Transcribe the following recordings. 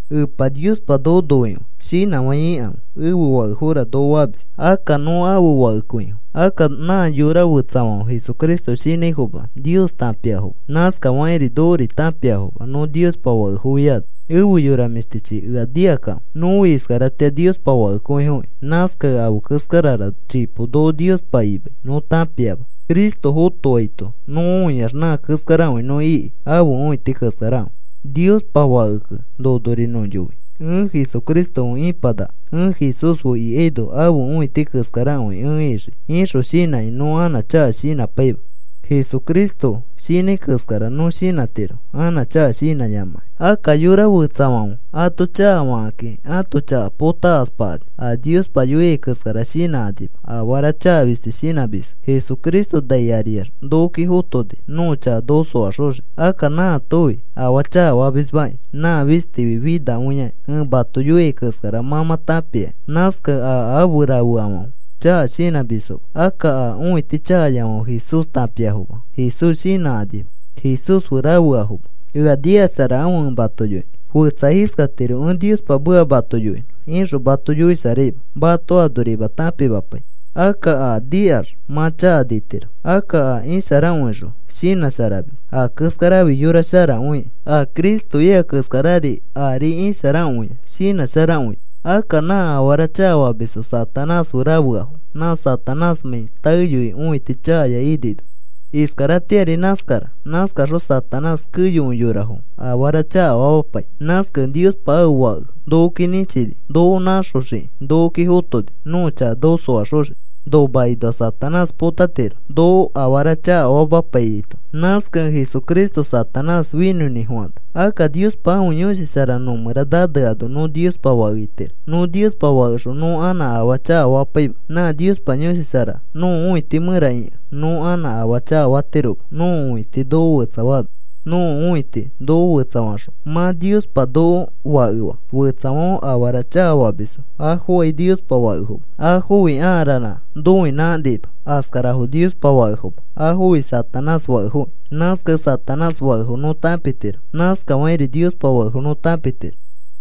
Epa Niospa noko noikõi. Shinãfãi ikãfe. “Ẽfe fakefora,” noko famis. Akka nõ ãfe fakekõifo. Akka nã yora fetsafãfe Jesucristo shinãifoma Nios tãpiafoma. Nãskafakĩri nokori tãpiafoma, nõ Niospa fakefofiano. Efe yora mĩshtichi, ea nikakãfe. Nõfi iskaratĩa Niospa fakekõifokĩ. Nãskakẽ afe keskarara chipo noko Niospa imai nõ tãpiama. Cristo fotoaito nõ õiax nã keskarakõi nõ iki, ãfe õiti keskarakõi. Niospa fakekẽ nonori nõ yoi: “Ẽ Jesucristo fe ipanaka. Ẽ Jesús fe ikaino ãfe õiti keskarakõi ẽ ixii,” ixõ shinãkĩ nõ anã chaka shinãpaima. Jesucristo shinãi keskarari nõ shinãtiro, anã chaka shinãyamakĩ. Akka yora fetsafãfe ato chakafakakĩ, ãto chaka potakaspakani, a Niospa yoiai keskara shinãkanima, afara chaka fisti shinãmisfo. Jesucristo nai ariax nokoki fotoni nõko chaka noko soaxoxiki. Akka nãatofi afaa chakafamismakĩ. Nã fistifi finakõiakĩ. Ẽ mato yoiai keskara mã mã tãpiakĩ. Nãskakẽ a afe rafeafãfe chaka shinãmisfoma. Akka a õiti chakayafãfe Jesús tãpiafoma, Jesús shinãkanima. Jesús fe rafeafoma. Ea nikasharakãfe, ẽ mato yoinõ. Fetsa iskatiro: “Ẽ Niospa meka mato yoinõ,” ixõ mato yoisharaima. Mato anorima tãpimapai, akka aa nikax mã chaka nitiro. Akka a isharakõixõ shinãsharamis. Aa keskarafi yora sharakõikĩ. A Cristo ika keskarari ari isharakõia shinãsharakõita. Akka nã afara chakafamisfo Satanás fe rafeafo. Nã Satanásmãi taeyoi õiti chakaya inino, iskaratĩari nãskara. Nãskaxõ Satanás keyokõi yorafo afara chakafamapai. Nãskakẽ Niospa ãfe Fake nokoki nĩchini. Noko nãxoxiki nokoki fotoni, nõko chaka noko soaxoxiki. Nomakinoa Satanás potatiro noko afara chakafamapaiyaito. Nãskakẽ Jesucristo Satanás finõinĩfofana. Akka Niospa ãfe Yõshi Shara nõmẽra naneano nõ Niospa fake itiro. Nõ Niospa fakexõ nõ anã afaa chakafapaima. Nã Niospa Yõshi Shara nõko õiti mẽra ikẽ nõ anã afaa chakafatiroma, nõko õiti noko fetsafaano. Nõko õiti noko fetsafaxõ, mã Niospa noko fakefa. Fetsafãfe afara chakafamisfo, afokai Niospa fakefoma. Afofi aa ranã noinãkanima. Askarafo Niospa fakefoma. Afofi Satanás fakefoki. Nãskakẽ Satanás fakefo nõ tãpitiro. Nãskafakĩri Niospa fakefo nõ tãpitiro.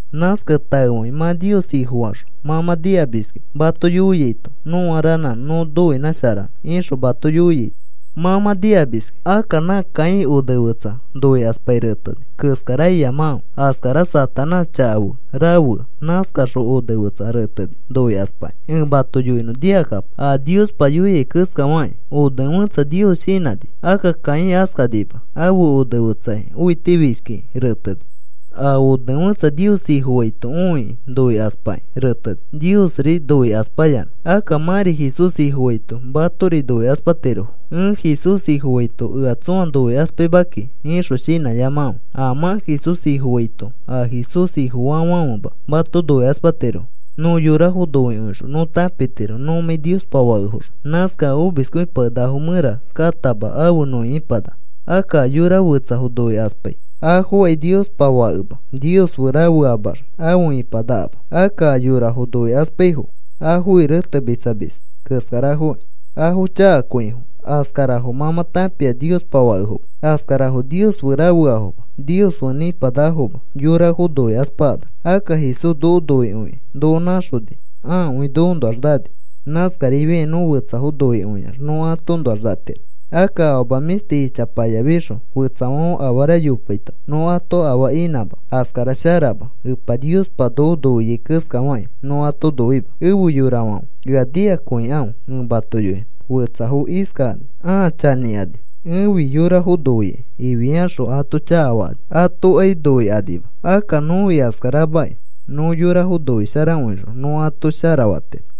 Nãskakẽ taefakĩ mã Nios Ifofaxõ mã mã nikamiskĩ mato yoiaito: “Nõa ranã nõ noinãsharanõ,” ixõ mato yoiaito mã mã nikamis. Akka nã Caín onefetsa noikaspakĩ reteni keskara iyamakãfe. Askara Satanás chaka fe rafea. Nãskaxõ onefetsa reteni noikaspakĩ, ẽ mato yoinõ nikakapo. A Niospa yoia keskafakĩ onefẽtsa Nios shinãni. Akka Caín askanima. Ãfe onefetsaki õitifishkikĩ reteni. A onefẽtsa Nios Ifofaito õikĩ noikaspakĩ reteni, Niosri noikaspayanã. Akka mãri Jesús Ifofaito, matori noikaspatirofo. “Ẽ Jesús Ifofaito ea tsõa noikaspaima kiki,” ixõ shinãyamakãfe. A mã Jesús Ifofaito a Jesús Ifofaafãfema mato noikaspatirofo. Nõ yorafo noikõixõ nõ tãpitiro nõmãi Niospa fakefoxõ. Nãskakẽ a omiskõipakenakafo mẽra katama, afe nõ ipanaka. Akka a yora fetsafo noikaspai, afokai Niospa fakema. Nios fe rafeamax afe ipanakama. Akka a yorafo noikaspaifo afofi retemitsamis keskarafoki. Afo chakakõifo. Askarafo mã mã tãpia Niospa fakefoma. Askarafo Nios fe rafeafoma. Nios fe nĩpanakafoma, yorafo noikaspakanax. Akka Jesús noko noikõikĩ, noko nãxoni. Ãakõi nokoõnoax nani. Nãskarifiakĩ nõ fetsafo noikõiax nõ atoõnoax natiro. Akka afama mĩshti ichapayafixõ, fetsafãfe afara yopaito nõ ato afaa inãmã, askara sharama. Epa Niospa noko noiai keskafakĩ, nõ ato noima. Efe yorafãfe, ea nikakõikãfe, ẽ mato yoinõ. Fetsafo iskakani, ãa chanĩkani: “Ẽfi yorafo noikai,” ifiaxõ ato chakafakani, atokai noikanima. Akka nõfi askaramakĩ. Nõ yorafo noisharakõixõ nõ ato shara fatiro.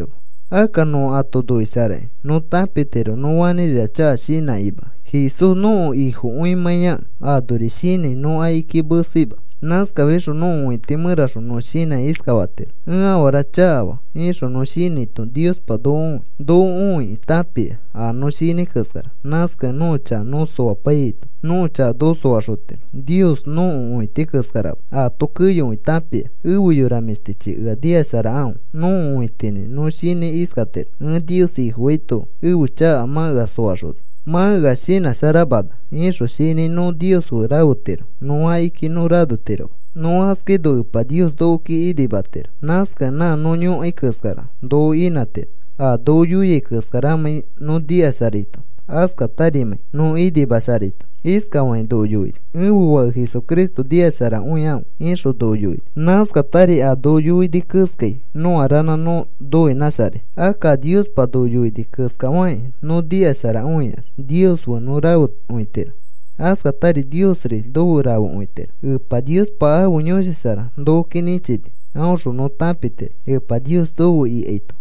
Akka nõ ato noisharakĩ nõ tãpitiro nõ fanĩrira chaka shinãkĩma, Jesús nõko Ifokõimãiyakẽ. Anori shinãi nõ akiki meseima. Nãskafixõ nõko õiti mẽraxõ nõ shinãkĩ iskafatiro: “Ẽ afara chakafaa,” ixõ nõ shinãito Niospa noko õi. Noko õikĩ tãpia a nõ shinãi keskara. Nãskakẽ nõko chaka nõ soapaiyaito nõko chaka noko soaxotiro. Nios nõko õiti keskarama. Aato keyokõi tãpia. Efe yora mĩshtichi, ea nikasharakãfe. Nõko õitinĩ nõ shinãi iskatiro: “Ẽ Nios Ifofaito ẽfe chaka mã ea soaxona, mã ea shinãsharamana,” ixõ shinãi, nõ Nios fe rafetiro, nõ akiki nõ ranotiroma. Nõ askaino Epa Nios nokoki inimatiro. Nãskakẽ nã nõ yõkai keskara noko inãtiro, a noko yoiai keskaramãi nõ nikasharaito, askatarimãi nõ inimamasharaito. Iskafakĩ noko yoini: “Ẽfe Fake Jesucristo nikasharakõikãfe,” ixõ noko yoini. Nãskatari a noko yoini keskai nõa ranã nõ noinãsharai. Akka a Niospa noko yoini keskafakĩ nõ nikasharakõiax Nios fe nõ rafekõitiro. Askatari Niosri nofe rafekõitiro. Epa Niospa ãfe Yõshi Shara nokoki nĩchini. Aõxõ nõ tãpitiro Epa Nios nofe ikaito.